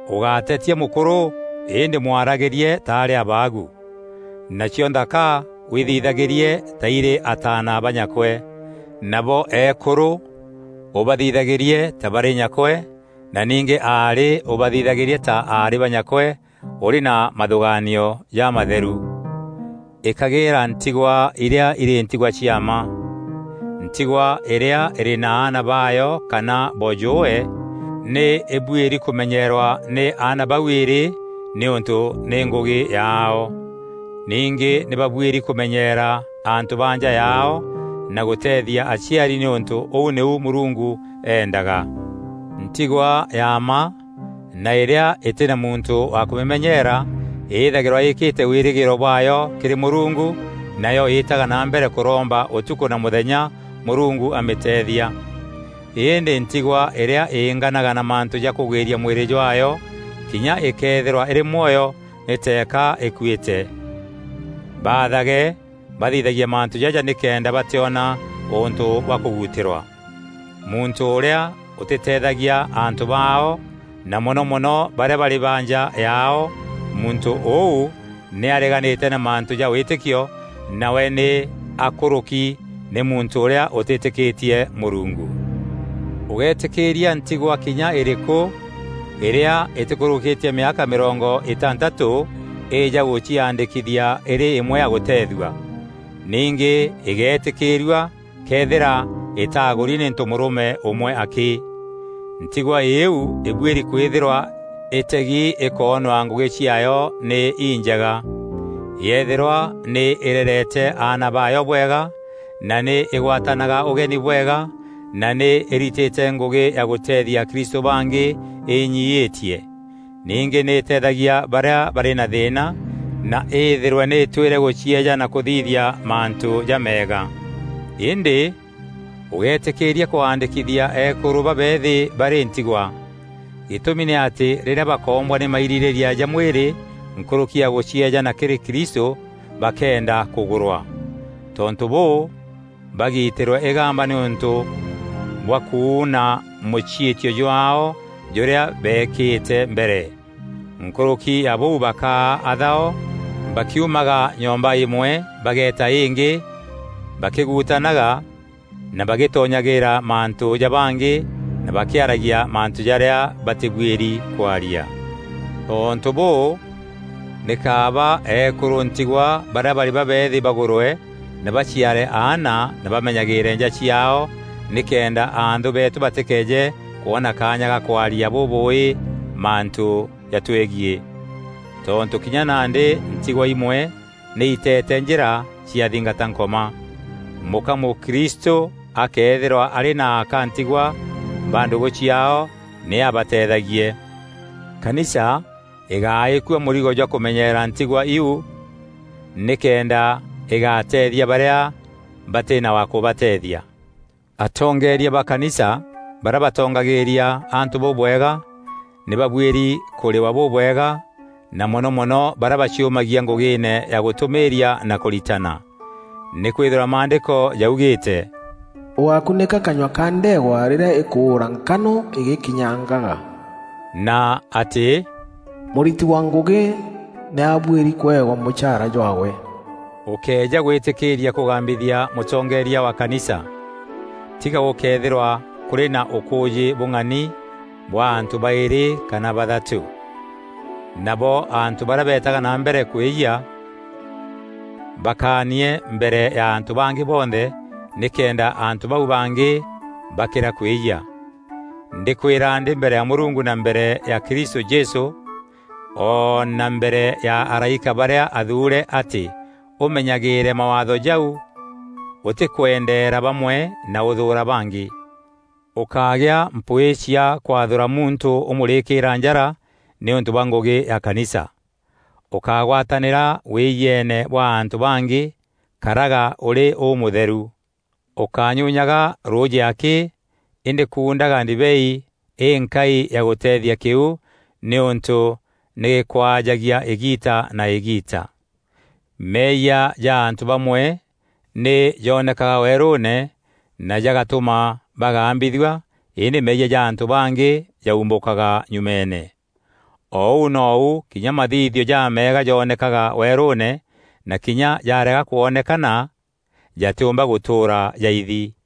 Ûgátetia mûkûrû îndî mwaragîrie ta arî abaagu. Nacio nthaka withithagîrie ta îrî ataana ba nyakwe. Nabo eekûrû ûbathithagîrie ta barî nyakwe na ningî aarî ûbathithagîrie ta aarî ba nyakwe ûrî na mathûgaanio jamatheru. Îkagîîra ntigwa irîa îrî ntigwa cia mma. Ntigwa îrîa îrî na aana baayo kana boojûûwe, nî îbuîri kûmenyeerwa nî aana bau îrî nîûntû nî ngûgî yaao. Ningî nî babuîri kûmenyeera antû ba nja yaao na gûteethia aciari nîûntû ûu nîu Mûrungu eendaga. Ntigwa ya mma na îrîa îtî na muntû wa kûmîmenyeera îthagîrwa îîkîte wîrîgîîro bwaayo kîrî Mûrungu, nayo îîtaga na mbere kûromba ûtukû na mûthenya Mûrungu amîteethia. Îndî ntigwa îrîa înganaga na mantû ja kûgwîria mwîrî jwaayo kinya këethîra îrî mwoyo nî teeka îkuîte. Baathage bathithagie mantû jaja nîkenda batîona ûntû bwa kûguutîrwa. Muntû ûrîa ûtîteethagia antû baao na mono mono barîa barî ba nja yaao, muntû ûu nî areganîte na mantû ja wîtîkio nawe nî akûrûki nî muntû ûrîa ûtîtîkîtie Mûrungu. Ûgéetîkîîria ntigwa kinya îrîkû îrîa îtîkûrûkîtie mîaka mîrongo îtantatû îîja gûciaandîkithia îrî îmwe ya gûteethua. Ningî îgéetîkîîrua këethîra îtaagûri nî ntomûrûme ûmwe akî. Ntigwa îîu îbuîri kwîthîrwa îtegi îkoonwa ngûgî ciaayo nî injega: yethîrwa nî îrerete aana baayo bwega na nî îgwatanaga ûgeni bwega na nî îritîte ngûgî ya gûteethia akristû bangî inyiîtie. Ningî nî îteethagia barîa barî na thîîna na îthîrwe nî îtwîre gûcieejana kûthithia mantû jameega. Îndî ûgéetîkîîria kwaandîkithia eekûrû babeethî barî ntigwa. Gîtûmi nî atî rîrîa bakoombwa nî mairîrîîria ja mwîrî nkûrûki ya gûcieejana kîrî Kristû, bakeenda kûgûrwa. Tontû bûû bagiitîrwe îgamba nîûntû bwa kuuna mûciîtio jwaao jûrîa beekîte mbere. Nkûrûki ya bûu bakaa athao, bakîumaga nyomba îmwe bageeta îngî bakîguutanaga na bagîtonyagîîra mantû ja bangî na bakîaragia mantû jarîa batîbuîri kwaaria. Tontû bûû, nî kaaba eekûrû ntigwa barîa barî babeethî bagûrwe na baciare aana na bamenyagîîre nja ciaao nîkenda anthû beetû batîkeeje kwona kaanya ga kwaaria bûbûûî mantû jatwegiî. Tontû kinya nandî ntîgwa imwe nî itete njîra ciathingata Nkoma. Mûka mûkristû akëethîrwa arî na aka ntigwa ba ndûgû ciaao, nî abateethagie. Kanisa îgáîkua mûrigo jwa kûmenyeera ntigwa iu nîkenda îgateethia barîa batî na wa kûbateethia. Atongeeria ba kanisa barîa batongagîîria antû bûbwega nî babuîri kûrîwa bûbwega na mono mono barîa baciumagia ngûgîîne ya gûtûmîîria na kûritana. Nîkwîthîrwa Maandîko jaugîîte, “Ûgákunîka kanyua ka ndeegwa rîrîa îkûûra nkano îgîkinyangaga,” na atî, “Mûriti wa ngûgî nî abuîri kûewa mûchaara jwaawe.” Ûkéeja gwîtîkîîria kûgambithia mûtongeeria wa kanisa, tiga gûkëethîrwa kûrî na ûkûûjî bûng'ani bwa antû baîrî kana bathatû. Nabo antû barîa betaga na mbere kwîyia baakanie mbere ya antû bangî bonthe nîkenda antû bau bangî bakîra kwîyia. Ndîkwîra ndî mbere ya Mûrungu na mbere ya Kristû Jesû o na mbere ya araîka barîa athuure atî ûmenyagîîre mawaatho jau ûtîkwendeera bamwe na ûthûûra bangî. Ûkágia mpwîî cia kwathûra muntû ûmûrîkîîra njara nîûntû bwa ngûgî ya kanisa. Ûkágwatanîra wîyieene bwa antû bangî; karaga ûrî ûmûtheru. Ûkányunyaga rûûjî akî îndî kuundaga ndibei îînkai ya gûteethia kîu nîûntû nî gîkwaajagia îgiita na îgiita. Meeyia ja antû bamwe nî jonekaga weerûûne na jagatûma bagambithua îndî meeyia ja antû bangî jaumbûkaga nyumeene. O ûu nou kinya mathithio jameega joonekaga weerûûne na kinya jarega kwonekana, jatîûmba gûtûûra jaithi.